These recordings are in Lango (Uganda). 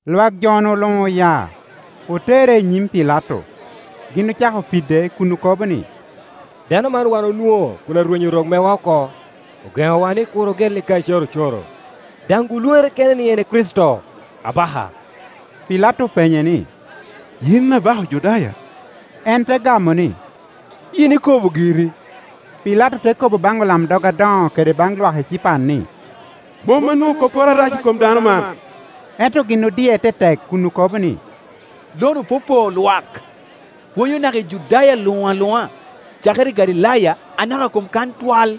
Lwak jo-nu luŋ oya, otere i nyim Pilato. Gin ocako pide kun okobo ni, “Dano man wan onwoŋo kun arwenyo rok mewa oko. Ogeŋowa ni kur ogelli Kaicari ocoro, daŋ-gu lwoŋere kene ni en e Kricito, abaka.” Pilato openye ni, “Yin abaka Ojudaya?” En te gamo ni, “Yin ikobo giri.” Pilato te kobo baŋ olamdog adoŋo kede baŋ lwak ecipan ni, “Mom anwoŋo kopporo arac i kom dano man.” Ento gin odie tetek kun okobo ni, “Lo-nu popoo lwak, pwonyo naka i Judaya luŋ aluŋa, cakere i Galilaya anaka kom kan twal.”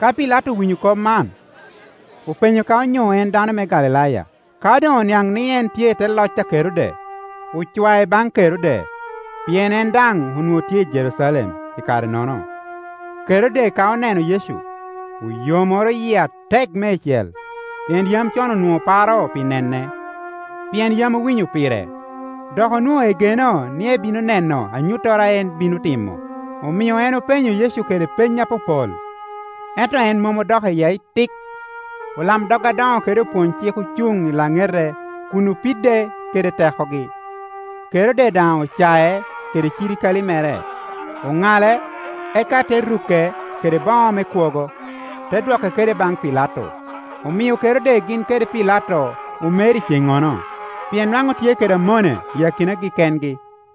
Ka Pilato owinyo kop man, openyo ka onyo en dano me Galilaya. Ka doŋ oniaŋ ni en tye i te loc a Kerode, ocwae baŋ Kerode, pien en daŋ onwoŋo tye i Jerucalem i kare-nono. Kerode ka oneno Yecu, oyomoro yie atek meicel, pien yam con onwoŋo paro pi nene, pien yam owinyo pire, dok onwoŋo egeno ni ebino neno anyuttoro a en bino timo. Omio en openyo Yecu kede peny apopol, ento en mom odok iye itik. Olamdog adoŋo kede opwony-cik ocuŋ i laŋete kun opide kede tekogi. Kerode daŋ ocae kede cirikale mere, oŋale, eka te ruke kede boŋo me kwogo, te dwoke kede baŋ Pilato. Omio Kerode gin kede Pilato omer i ceŋŋono, pien nwaŋ otye kede amone i akinagi kengi.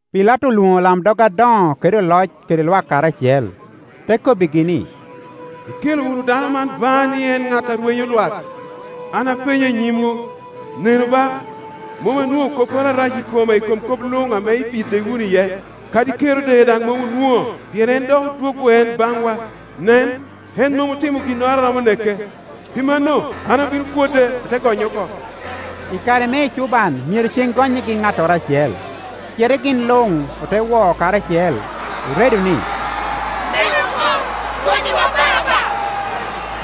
Pilato olwoŋo olamdog adoŋo kede oloc kede lwak karacel, te kobbigi ni, “Ikelo wunu dano man baŋa ni en ŋat a rwenyo lwak. An apenye i nyimwu, nenu ba, mom anwoŋo kopporo arac i kome i kom kop luŋ ame ipide wunu iye. Kadi Kerode daŋ mom onwoŋo, pien en dok odwoggo en baŋwa. Nen, en mom otimo ginnoro a romo neke. Pi mano, an abino pwode, ate gonye oko.” [ I kare me ecuban myero ceŋ gonnyigi ŋattoro acel.] Cite gin luŋ ote wo karacel, oredo ni, “Neke oko! Gonnyiwa Baraba!”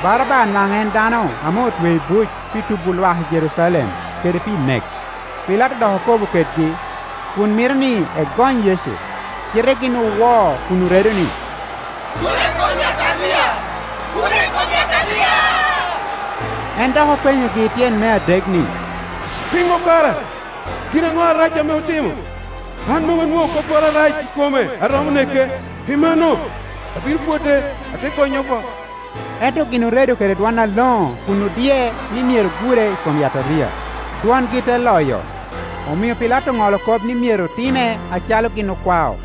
Baraba nwaŋ en dano ame otweo i buc pi tubo lwak i Jerucalem, kede pi nek. Pilato dok okobo kedgi, kun mito ni egony Yecu, cite gin owo kun oredo ni, “Gure i kom yataria! Gure i kom yataria!” En dok openyogi tyen me adek ni, “Piŋo kara? Gin aŋo arac ame otimo? An mom anwoŋo kopporo arac i kome a romo neke. Pi mano, abino pwode, ate gonye oko.” Ento gin oredo kede dwon aloŋo kun odie ni myero gure i kom yataria, dwongi te loyo; omio Pilato oŋolo kop ni myero time acalo gin okwao.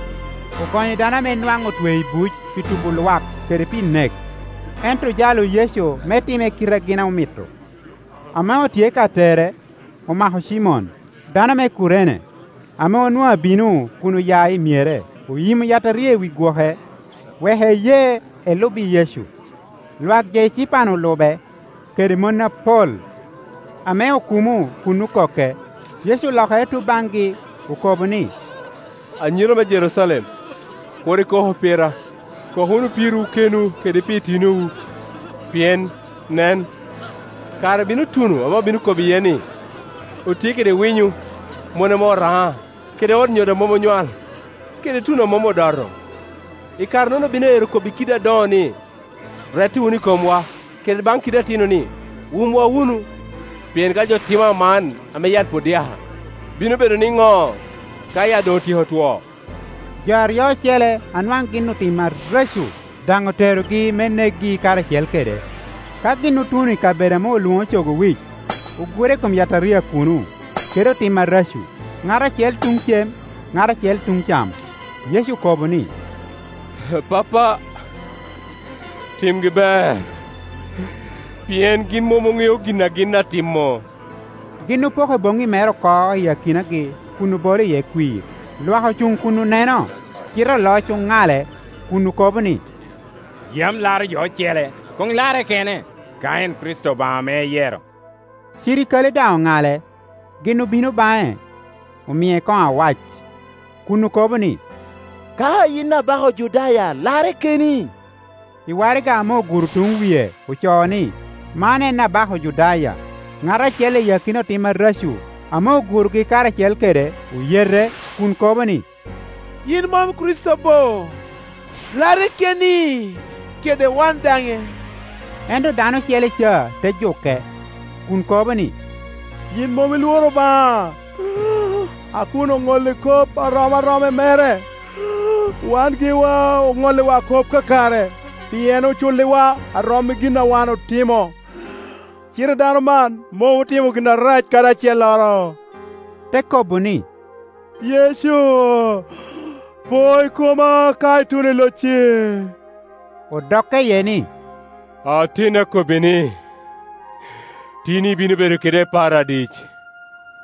Ogonyo dano ame nwaŋ otweo i buc pi tubo lwak kede pi nek; ento ojalo Yecu me time kite a gin omito. Ame otye ka tere, omako Cimon, dano me Kurene, ame onwoŋo abino kun oya i myere, oyimo yataria i wi gwoke, wek eye, elub i Yecu. Lwak jo ecipan olu be, kede mon apol, ame okumo kun okoke. Yecu olokere tuŋ baŋgi, okobo ni, “Anyira me Jerucalem, kur ikoku pira; kok wunu pirwu kenwu kede pi itinowu. Pien, nen, kare bino tuno ame obino kobo iye ni, ‘Otye kede winyo, mon ame oraŋa, kede ot nyodo a mom onywal, kede tuno ame mom odoto!’ I kare-nono obino ero kobbi kiddi adoŋo ni, ‘Rette wunu i komwa’; kede baŋ kiddi atino ni, ‘Wumwa wunu’. Pien ka jo timo man ame yat pwod dyaka, bino bedo nino ka yat doŋ otyeko two?” Jo aryo ocele a nwaŋ gin otim areco daŋ oterogi me nekgi karacel kede. Ka gin otuno i kabedo ame olwoŋo Cogo Wic, ogure i kom yataria kuno, kede otim areco, ŋat acel tuŋ cem, ŋat acel tuŋ cam. Yecu okobo ni, “Pappa, timgi ber, pien gin mom oŋeo gin a gin atimmo.” Gin opoko boŋŋi mere oko i akinagi kun obolo iye kwir. Lwak ocuŋ kun oneno, cite oloc oŋale, kun okobo ni, “Yam laro jo ocele; koŋ larre kene, ka en Kricito Obaŋa ame eyero!” Cirikale daŋ oŋale; gin obino baŋe, omie koŋo awac, kun okobo ni, “Ka yin Abaka Ojudaya, larre keni!” I waraga ame oguro tuŋ wie ocoo ni, “Man en Abaka Ojudaya.” Ŋat acel i akina otim areco ame ogurogi karacel kede oyete kun kobo ni, “Yin mom i Kricito bo? Larre keni, kede wan daŋe!” Ento dano ocele ca te juke, kun kobo ni, “Yin mom ilworo Obaŋa, a kun oŋolli kop a rom aroma i mere? Wan giwa oŋolliwa kop kakare, pien oculliwa a rom i gin a wan otimo; cite dano man mom otimo gin arac kadi acelloro.” Te kobo ni, “Yecu, po i koma ka ituno i locci.” Odokke iye ni, “Ateni akobbi ni, tin ibino bedo keda i Paradic.”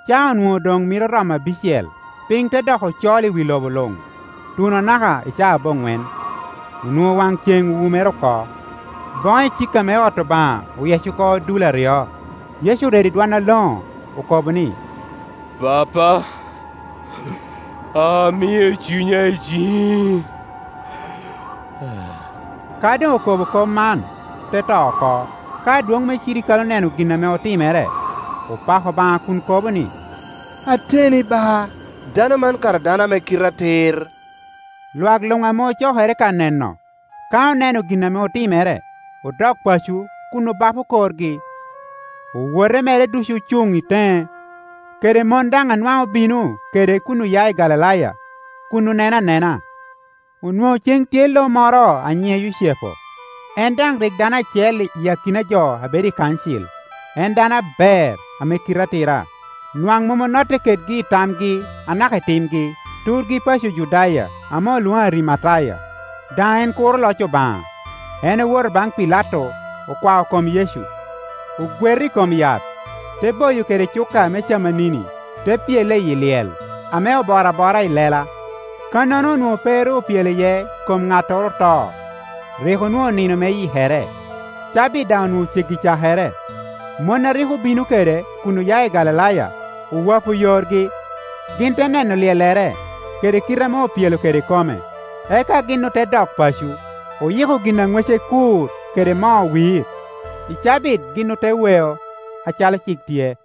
Caa onwoŋo doŋ mito romo abicel, piny te doko col i wi lobo luŋ, tuno anaka i caa aboŋwen. Onwoŋo waŋ ceŋ owumere oko; boŋo icika me ot Obaŋa oyec oko dul aryo. Yecu oredo i dwon aloŋo, okobo ni, “Pappa, amio cunya i ciŋi.” Ka doŋ okobo kop man, te to oko. Ka adwoŋ me cirikale oneno gin ame otimere, opako Obaŋa kun kobo ni, “Ateni, ba, dano man kara dano ame kite atir!” Lwak luŋ ame ocokere ka neno, ka oneno gin ame otimere, odok paco kun obapo korgi. Owote mere ducu ocuŋ i teŋe, kede mon daŋ a nwaŋ obino kede kun oya i Galilaya, kun oneno anena. Onwoŋo cen tye lo moro a nyiŋe Yucepu; en daŋ rik dano acel i akina jo a bedo i kancil, en dano aber, ame kite atira. Nwaŋ mom onotte kedgi i tamgi anaka i timgi. Turgi paco Ojudaya ame olwoŋo Arimataya; daŋ en kuro loc Obaŋa. En owoto baŋ Pilato, okwao kom Yecu, ogweto i kom yat, te boyo kede cuka me camanini, te pyele iyi lyel ame oboro abora i lela; kannono onwoŋo pe ru opyelo iye kom ŋattoro oto. Rik onwoŋo nino me Yikere, cabit daŋ onwoŋo ceggi cakere. Mon a rik obino kede kun oya i Galilaya owapo yorgi, gin te neno lyellere, kede kite ame opyelo kede kome; eka gin ote dok paco, oyiko gin a ŋwece kur kede moo wir. I cabit gin ote weo, acalo cik tye.